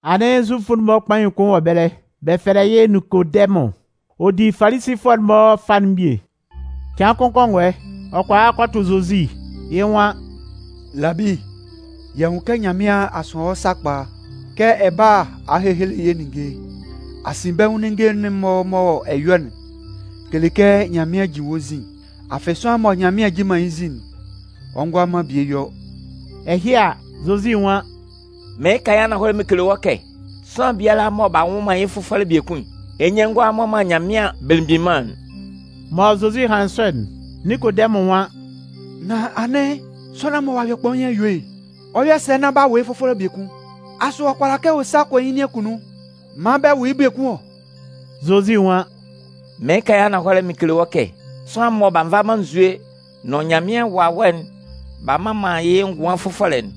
Anɩn Zufʋ'n-mɔ kpain kʋn wɔ ɛbɛlɛ, bɛ fɛlɛ yɩ́ Ninkodɛmʋn. Ɔ di Falisifʋɛ'n-mɔ fâ'n bie. Cɩan kʋn kɔngɔɛ, ɔ kɔ a kɔ tʋ Zozi. Yɩ́ nwan: “Labi, y'a nwun kɛ Nyanmɩan a sʋan wɔ́ sakpa kɛ ɛ bála a hehele yɛ́ ninnge. Asinbɛnwʋn ninnge'n-mɔ mɔ ɛ yɔ'n kele kɛ Nyanmɩan jin wɔ́ nzin. Afɩ sʋanlan mɔ Nyanmɩan jin man yɩ́ nzin'n, ɔ ngʋala man bie yɔ.” Ɛhɩ a, Zozi nwan: “Mɩɩn kan yɩ́ ananhɔlɛ mɩn kele wɔ́ kɛ sʋanlan biala mɔ b'a nwʋ man yɩ́ fʋfɔlɛ biekun'n, yɩ́ nyɩn ngʋala mmɔ man Nyanmɩan Belemgbin Mân'n.” Mɔ Zozi hanlɩn sɔ'n, Ninkodɛmʋn nwan: “Nan anɩn, sʋanlan mɔ ɔ'a yɔ kpain a yue'n, ɔ 'yɔ sɛ nán b'a wʋ yɩ́ fʋfɔlɛ biekun? Asʋ ɔ kʋala kɛ ɔ sa kɔ yɩ́ nin akunnun maan bɛ wʋ yɩ́ biekun ɔ?” Zozi nwan: “Mɩɩn kan yɩ́ ananhɔlɛ mɩn kele wɔ́ kɛ sʋanlan mɔ b'a nva man nzue nʋn Nyanmɩan Wawɛ'n b'a mman man yɩ́ ngʋan fʋfɔlɛ'n,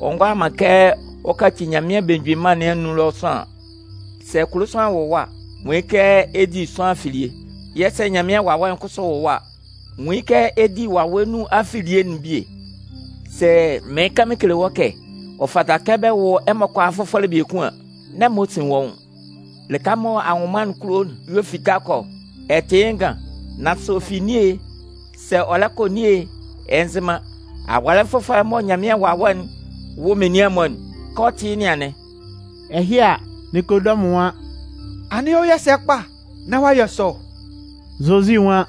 ɔ ngʋala man kɛ ɔ kaci Nyanmɩan Belemgbin Mân nɩn anun sʋanlan. Sɛ kulo sʋanlan wʋ wɔ́ a, nwun yɩ́ kɛ ɛ di sʋanlan afilie. Yɛ̂ sɛ Nyanmɩan Wawɛ'n kʋsʋ wʋ wɔ́ a, nwun yɩ́ kɛ ɛ di yɩ́ Wawɛ nun afilie'n bie. Sɛ mɩɩn kan mɩn kele wɔ́ kɛ ɔ fata kɛ bɛ wʋ́ ɛmɔ kʋalaa fʋfɔlɛ biekun an, n'ɛ man ɔ sin wɔ́ nwʋn. Lɩka mɔ anwʋnman'n kulo'n y'ɔ fita kɔ ɔ. Ɛ tɩ yɩ́ ngan, nan sɛ ɔ fi nin e, sɛ ɔ lɛ kɔ nin e, ɛ nzɩ man. Awɔlɛ fʋfɔlɛ'n mɔ Nyanmɩan Wawɛ'n wʋ menian'n-mɔ'n, kɛ ɔ tɩ yɩ́ nɩn anɩn.” Ɛhɩ a, Ninkodɛmʋn nwan: “Anɩn ɔ 'yɔ sɛ kpa nán ɔ'a yɔ sɔ?” Zozi nwan: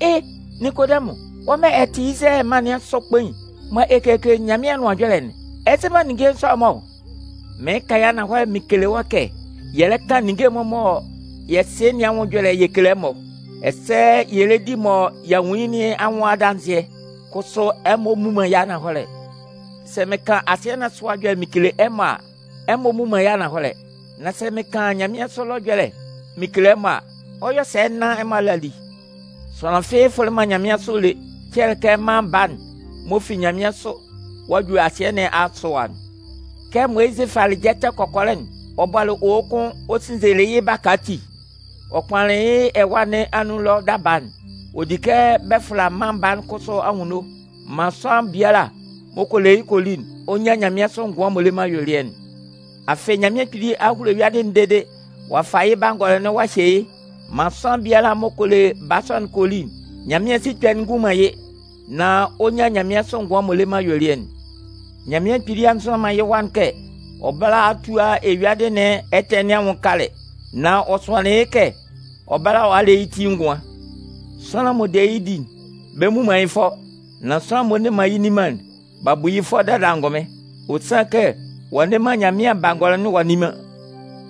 “E! Ninkodɛmʋn, wɔ́ mɔ ɛ tɩ Izalayɛ mân nɩn asʋ kpain mɔ ɛ kekele Nyanmɩan anʋan ɛjɔlɛ'n, ɛ nzɩ man ninnge sɔ'n-mɔ ɔ? Mɩɩn kan yɩ́ ananhɔlɛ mɩn kele wɔ́ kɛ yɛ lɛ kan ninnge'n-mɔ mɔ yɛ sɩ nɩn anwʋn ɛjɔlɛ yɛ kele ɛmɔ, ɛsɛ yɛ lɛ di mɔ y'a nwun yɩ́ nɩn anwʋn adanzɩɛ, kʋsʋ ɛmɔ mmu man yɩ́ ananhɔlɛ. Sɛ mɩn kan asɩɛ nɩn asʋ ɛwa ɛjɔlɛ mɩn kele ɛmɔ a, ɛmɔ mmu man yɩ́ ananhɔlɛ, nan sɛ mɩn kan nyanmɩansʋ ɛlɔ ɛjɔlɛ mɩn kele ɛmɔ a, ɔ 'yɔ sɛ nán ɛmɔ a le a li? Sʋanlan fɩ́ɩ́ fʋlɩ man nyanmɩansʋ lé, cɛlɛ kɛ Mân Baa'n m'ɔ fi nyanmɩansʋ ɔ'a ju asɩɛ nɩn asʋ ɛwa'n. Kɛ Moyizɩ falɩ jɛtɛ kɔkɔlɛ'n ɔ bɔlɩ owo kʋn ɔ sinnzelɩ yɩ́ baka ati ɔ kpanlanlɩn yɩ́ ɛwâ nɩn anun ɛlɔ daba'n, ɔ di kɛ bɛ fʋla Mân Baa'n kʋsʋ anwunno, maan sʋanlan biala m'ɔ kɔ le yɩ́ kɔ li'n, ɔ nyan nyanmɩansʋ ngʋan m'ɔ le man ayuelɩɛ'n.” Afɩ, Nyanmɩan Kpili a hulo eyuadɩ'n dede ɔ'a fa yɩ́ Bangɔlɔ'n ɔ'a hye yɩ́ maan sʋanlan biala m'ɔ kɔ le Baa sɔ'n kɔ li'n, Nyanmɩan sikpɛ'n ngun man yɩ́, nan ɔ nyan nyanmɩansʋ ngʋan m'ɔ le man ayuelɩɛ'n. Nyanmɩan Kpili a nzʋan man yɩ́ Wa'n kɛ ɔ bála a tua eyuadɩ nɩn ɛtɛ nɩn anwʋn kalɛ, nan ɔ sʋanlɩn yɩ́ kɛ ɔ bála a le yɩ́ ti ngʋan. Sʋanlan m'ɔ de yɩ́ di'n, bɛ mmu man yɩ́ fʋɔ, nan sʋanlan m'ɔ nne man yɩ́ nni man'n, b'a bu yɩ́ fʋɔ dada angʋnmɩn. Ɔ sanlɩn kɛ ɔ'a nne man Nyanmɩan Bangɔlɔ'n ɔ'a nni man.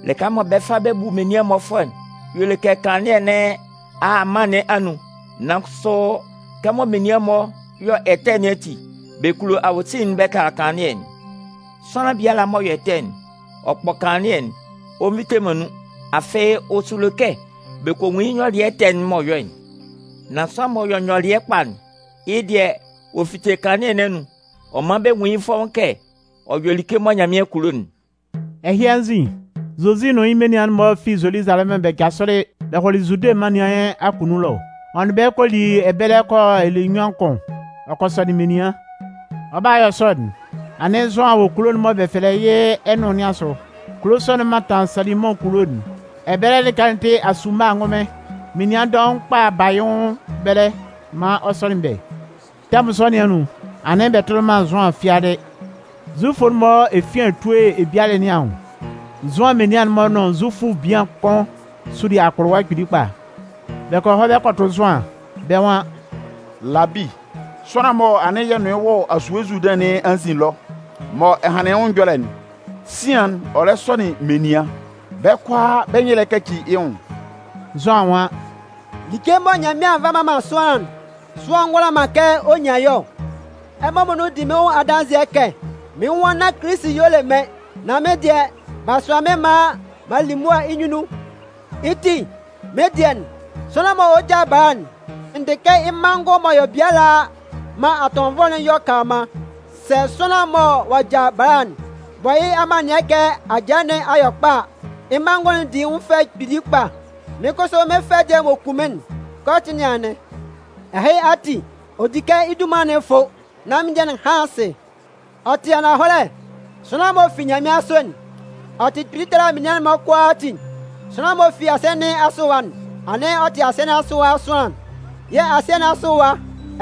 Lɩka mɔ bɛ 'fa bɛ bu menian'n-mɔ fʋɔ'n, y'ɔ le kɛ kanlannɩɛ nɩn a a mân nɩn anun, nan kʋsʋ kɛmɔ menian'n-mɔ yɔ ɛtɛ nɩn ati, bɛ kulo awosin'n bɛ tala kanlannɩɛ'n. Sʋanlan biala m'ɔ yɔ ɛtɛ'n, ɔ kpɔ kanlannɩɛ'n, ɔ nvite man nun, afɩ ɔ sulo kɛ bɛ kɔ nwun yɩ́ nyɔlɩɛ ɛtɛ'n m'ɔ yɔ'n. Nan sʋanlan m'ɔ yɔ nyɔlɩɛ kpa'n, yɩ́ dɩɛ, ɔ fite kanlannɩɛ nɩn anun, ɔ man bɛ nwun yɩ́ fɔ́ʋ́n kɛ ɔ yɔ like mɔ Nyanmɩan kulo'n. Ɛhɩ anzin, Zozi nʋn yɩ́ menian'n-mɔ fi Zoluzalɛmʋn bɛ jasʋlɩ bɛ hɔlɩ Zude mân nɩn akunnun ɛlɔ. Ɔ nʋn bɛ́ kɔ li ɛbɛlɛ kɔ yɔ ɛlɛ nnyuan kʋn, ɔ kɔ sɔnɩn menian. Ɔ 'ba yɔ sɔ'n, anɩn Zʋan wɔ kulo'n mɔ bɛ fɛlɛ yɩ́ Ɛnʋn nɩn asʋ. Kulo sɔ'n mantan Salimʋn kulo'n. Ɛbɛlɛ lɩka'n tɩ asuma ngʋnmɩn. Menian dɔʋn kpa ba yɩ́ nwʋn ɛbɛlɛ maan ɔ sɔnɩn bɛ́. Tɛmʋn sɔ nɩn anun, anɩn bɛ tʋlɩ man Zʋan fiadɩ. Zufʋ'n-mɔ efian etue ebialɛ nɩn anwʋn, Zʋan menian'n-mɔ nʋn Zufʋ bian kʋn suli akpʋlʋwa kpili kpa. Bɛ kɔ hɔ bɛ kɔ tʋ Zʋan, bɛ́ nwan: “Labi, sʋanlan'n mɔ anɩn yɛ nʋn yɩ́ wɔ asue Zuludɩn nɩn anzin ɛlɔ mɔ ɛ hanlɩn yɩ́ ɛjɔlɛ'n, sian'n, ɔ lɛ sɔnɩn menian, bɛ́ kʋalaa bɛ́ nyɩn lɛ kaci yɩ́ nwʋn.” Zʋan nwan: “Like mɔ Nyanmɩan a nva a mman man sʋanlan'n, sʋanlan ngʋala man kɛ ɔ nyan yɩ́ ɔ. Ɛmɔ muonun di mɩ́n adanzɩɛ kɛ mɩ́n nwan nán Kilisi'n y'ɔ le mɩ́n, nan mɩ́n dɩɛ, b'a sʋan mɩ́n maan m'an li mʋa yɩ́ nyunnun. Yɩ́ ti, mɩ́n dɩɛ, sʋanlan'n m'ɔ lɛ ja bala'n, n dɩ kɛ yɩ́ manngʋn m'ɔ yɔ biala maan atɔnvɔlɛ'n yɔ kanlanman. Sɛ sʋanlan'n mɔ ɔ'a ja bala'n bɔ yɩ́ amannɩɛ kɛ ajaa nɩn a yɔ kpa a, yɩ́ manngʋn'n di yɩ́ nwʋn fɛ kpili kpa. Mɩ́n kʋsʋ mɩ́n fɛ dɩɛ m'ɔ kun mɩ́n'n, kɛ ɔ tɩ yɩ́ nɩn anɩn. Ɛhɩ ati, ɔ di kɛ yɩ́ dunman'n fʋ́, nán mɩ́n dɩɛ'n hán asɩ.” Ɔ tɩ ananhɔlɛ, sʋanlan m'ɔ fi nyanmɩansʋ'n, ɔ tɩ kpili tala menian'n-mɔ kʋalaatin. Sʋanlan m'ɔ fi asɩɛ nɩn asʋ ɛwa'n, anɩn ɔ tɩ asɩɛ nɩn asʋ sʋanlan, yɛ̂ asɩɛ nɩn asʋ ɛwa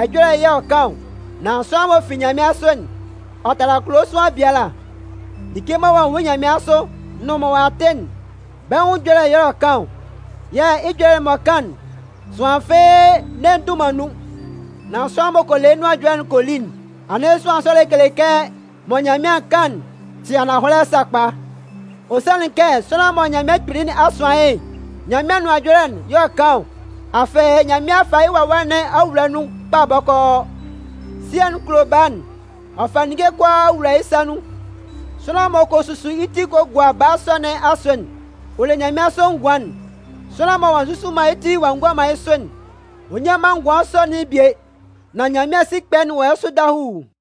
ɛjɔlɛ y'ɔ kan ɔ. Nan sʋanlan m'ɔ fi nyanmɩansʋ'n, ɔ tala kulo sʋanlan biala. Like mɔ ɔ'a nwun yɩ́ nyanmɩansʋ nʋn mɔ ɔ'a tɩ'n, bɛ́ nwʋn ɛjɔlɛ y'ɔ kan ɔ. Yɛ̂ yɩ́ ɛjɔlɛ m'ɔ kan'n, sʋanlan fɩ́ɩ́ nne ndʋ man nun. Nan sʋanlan m'ɔ kɔ le yɩ́ nʋan ɛjɔlɛ'n kɔ li'n, anɩn sʋanlan sɔ'n lɛ kele kɛ mɔ Nyanmɩan kan'n tɩ ananhɔlɛ sakpa. Ɔ sanlɩn kɛ sʋanlan mɔ Nyanmɩan Kpili a sʋan yɩ́'n, Nyanmɩan Anʋan Ɛjɔlɛ y'ɔ kan ɔ. Afɩ Nyanmɩan a fa yɩ́ Wawɛ nɩn a wula yɩ́ nun kpa bɔkɔɔ. Sɩɛ'n kulo Baa'n, ɔ'a fa ninnge kʋalaa ɔ'a wula yɩ́ sa nun. Sʋanlan m'ɔ kɔ susu yɩ́ ti kɔ gua Baa sɔ nɩn asʋ'n, ɔ le nyanmɩansʋ ngʋan'n. Sʋanlan mɔ ɔ'a nzusu man yɩ́ ti ɔ'a gua man yɩ́ sʋ'n, ɔ nnyan man ngʋan sɔ'n bie. Nan Nyanmɩan sikpɛ'n wɔ yɩ́ sʋ dahuu.